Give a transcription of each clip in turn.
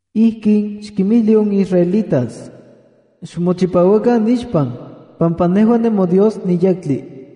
“Ijkin xkinmijli on israelitas: Xmochipauakan nixpan, pampa nejua nemoDios niyektli.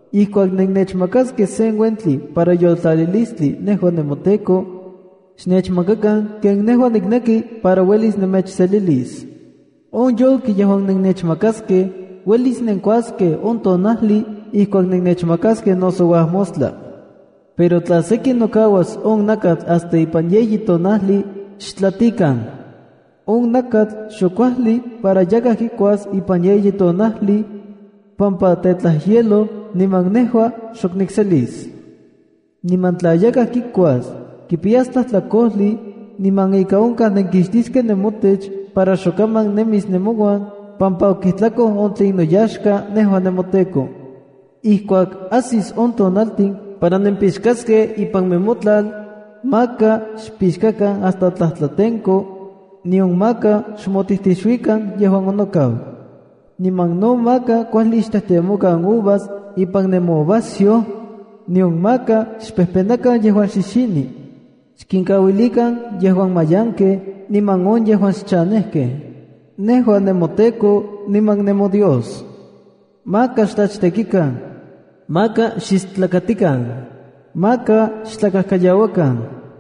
’Ijkuak nennechmakaskej sen uentli para yoltlalilistli nejua nemoTEKO, xnechmakakan ken nejua nikneki para uelis nemechselilis. On yolki yejuan nennechmakaskej uelis nenkuaskej on tonajli ijkuak nenechmakaskej noso uajmostla. Pero tla seki nokauas on nakatl hasta ipan yeyi tonajli, xtlatikan. On nakatl xok kuajli para yakaj kikuas ipan yeyi tonajli, pampa tetlajyeloj niman nejua xok nikselis. Niman tla yakaj kikuas, kipiyas tlajtlakojli, niman ika onkaj nenkixtiskej nemotech para xokaman nemis nemouan, pampa okijtlakoj on tlen noyaxka nejua nemoTEKO. ’Ijkuak ajsis on tonaltin para nempixkaskej ipan nemotlal, maka xpixkakan hasta tlajtlatenko, nion maka xmotijtixuikan yejuan onokau. Niman no maka kuajli xtejtemokan uvas ipan nemouvasyoj, nion maka xpejpenakan yejuan xixini. Xkinkauilikan yejuan mayankej niman on yejuan xchanejkej. Nejua nemoTEKO niman nemoDios. ’Maka xtlachtekikan. ’Maka xistlakatikan. ’Maka xtlakajkayauakan.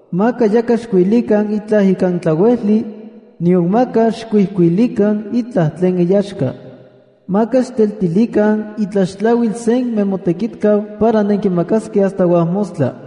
’Maka yakaj xchiuilikan itlaj ikan tlauejli, nion maka xkuijkuilikan itlaj tlen iyaxka. ‘Maka xteltilikan itlaxtlauil sen nemotekitkau para nenkimakaskej hasta uajmostla.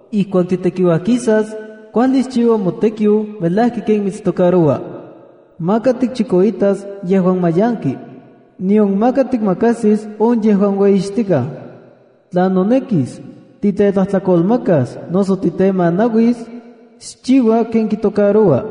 ’Ijkuak titekiuajkisas, kuajli xchiua motekiu melajki ken mitstocaroua. Maka tikchikoitas yejuan mayanki, nion maka tikmakajsis on yejuan ueyixtikaj. Tla nonekis, titetlajtlakolmakas noso titemanauis, xchiua ken kitocaroua.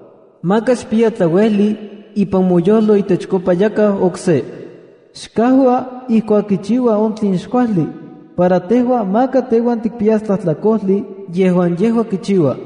’Maka xkipiya tlauejli ipan moyojlo itechkopa yakaj okse. “Xkajua ijkuak kichiua on tlen xkuajli, para tejua maka teuan tikpiyas tlajtlakojli yejuan yejua kichiua.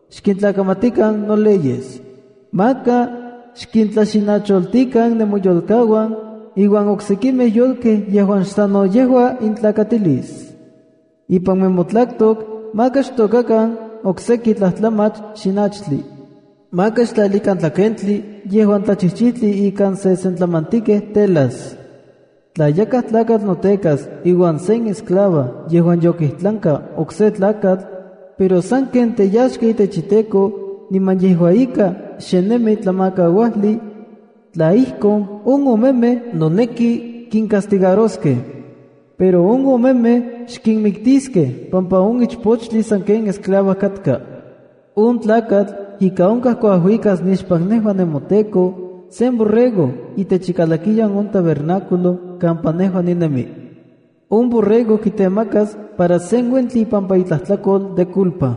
’Xkintlakamatikan noleyes. ’Maka xkintlaxinacholtikan nemoyolkauan iuan oksekimej yolkej yejuan xsano yejua intlakatilis. ’Ipan nemotlatok maka xtôkakan okseki tlajtlamach xinachtli. ’Maka xtlalikan tlakentli yejuan tlachijchijtli ikan sesentlamantikej telas. ’Tla yakaj tlakatl notekas iuan sen esclava yejuan yokijtlanka ok se tlakatl, pero sanken teyaxka itech iteko niman yejua ika xe nemi tlamakauajli, tla ijkon, on omemej noneki kincastigaroskej. Pero on omemej xkinmiktiskej pampa on ichpochtli sanken esclava katka. On tlakatl ika onkaj kuajuikas nixpan nejua nemoTEKO, sen borrego itech ikalakiyan on tabernáculo kampa nejua ninemi. On borrego kitemakas para sen uentli ipampa itlajtlakol de culpa.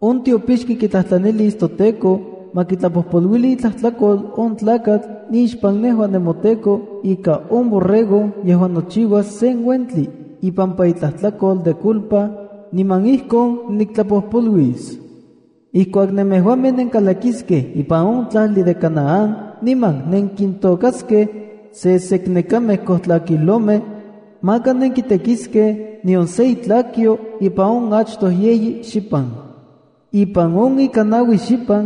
On tiopixki kitlajtlanilis toTEKO ma kitlapopoluili itlajtlakol on tlakatl nixpan nejua nemoTEKO ika on borrego yejuan nochiuas sen uentli ipampa itlajtlakol de culpa, niman ijkon niktlajpojpoluis. ’Ijkuak nemejuamej nenkalakiskej ipan on tlajli de Canaán niman nenkintôkaskej seseknekamej kojtlakijlomej, maka nenkitekiskej nion se itlakyo ipan on achtoj yeyi xipan. Ipan on ika naui xipan,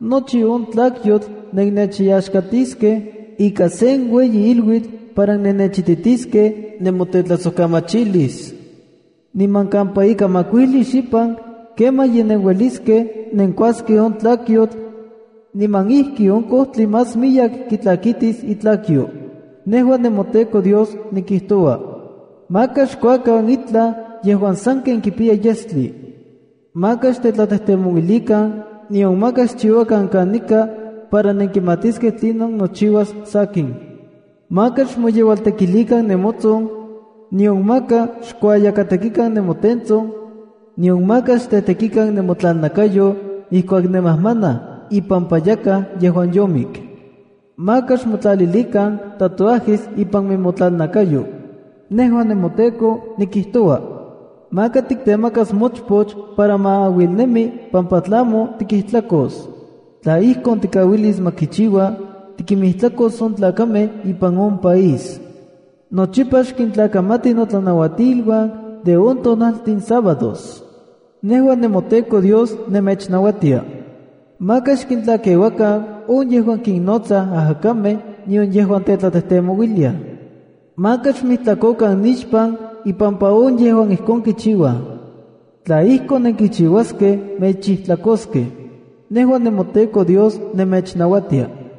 nochi on tlakyotl nennechyaxkatiskej ika sen ueyi iluitl para nenechititiskej nemotetlajsojkamachilis. Niman kampa ika makuijli xipan, kemaj ye nenueliskej nenkuaskej on tlakyotl, niman ijki on kojtli más miyek kitlakitis itlakayo. Nejua nemoTEKO Dios nikijtoua. ’Maka xkuakan itlaj yejuan sanken kipiya yestli. ’Maka xtetlatejtemouilikan, nion maka xchiuakan kanika para nenkimatiskej tlinon nochiuas sakin. ’Maka xmoyeualtekilikan nemotson, nion maka xkuayakatekikan nemotentson, nion maka xtetekikan nemotlalnakayo ijkuak nemajmanaj ipampa yakaj yejuan yomik. ’Maka xmotlalilikan tatuajesa ipan nemotlalnakayo. Nejua nemoTEKO nikijtoua. ’Maka tiktemakas mochpoch para ma auilnemi pampa tlamo tikijtlakos. Tla ijkon tikauilis ma kichiua, tikinmijtlakos on tlakamej ipan on país. ’Nochipa xkintlakamati notlanamatiluan de on tonaltin sabádos. Nejua nemoTEKO Dios nemechnauatia. ’Maka xkintlakeuakan on yejuan kinnotsaj ajakamej nion yejuan tetlatejtemouiliaj. Maka xmijtlakokan nixpan impampa on yejuan ijkon kichiuaj. Tla ijkon nenkichiuaskej, mechijtlakoskej. Nejua nemoTEKO Dios nemechnauatia.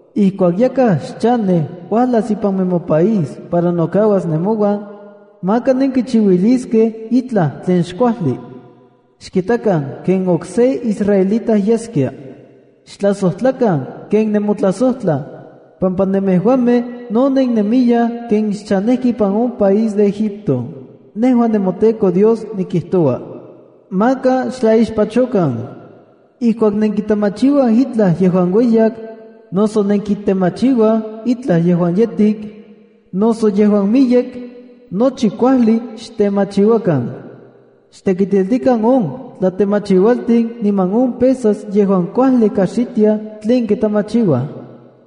’Ijkuak yakaj xchanej uajlas ipan nemopaís para nokauas nemouan, maka nenkichiuiliskej itlaj tlen xkuajli. Xkitakan ken okse israelita yeskia. Xtlajsojtlakan ken nemotlajsojtlaj, pampa nemejuamej no nennemiyaj ken xchanejkej ipan on país de Egipto. Nejua nemoTEKO Dios nikijtoua. ’Maka xtlaixpachokan. Ijkuak nenkitemachiuaj itlaj yejuan ueyak, noso nenkitemachiuaj itlaj yejuan yetik, noso yejuan miyek, nochi kuajli xtemachiuakan. Xtekitiltikan on tlatemachiualtin niman on pesas yejuan kuajli kajxitia tlen kitemachiua.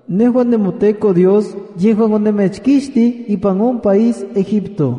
Nejua nemoTEKO Dios yejuan onemechkixtij ipan on país Egipto.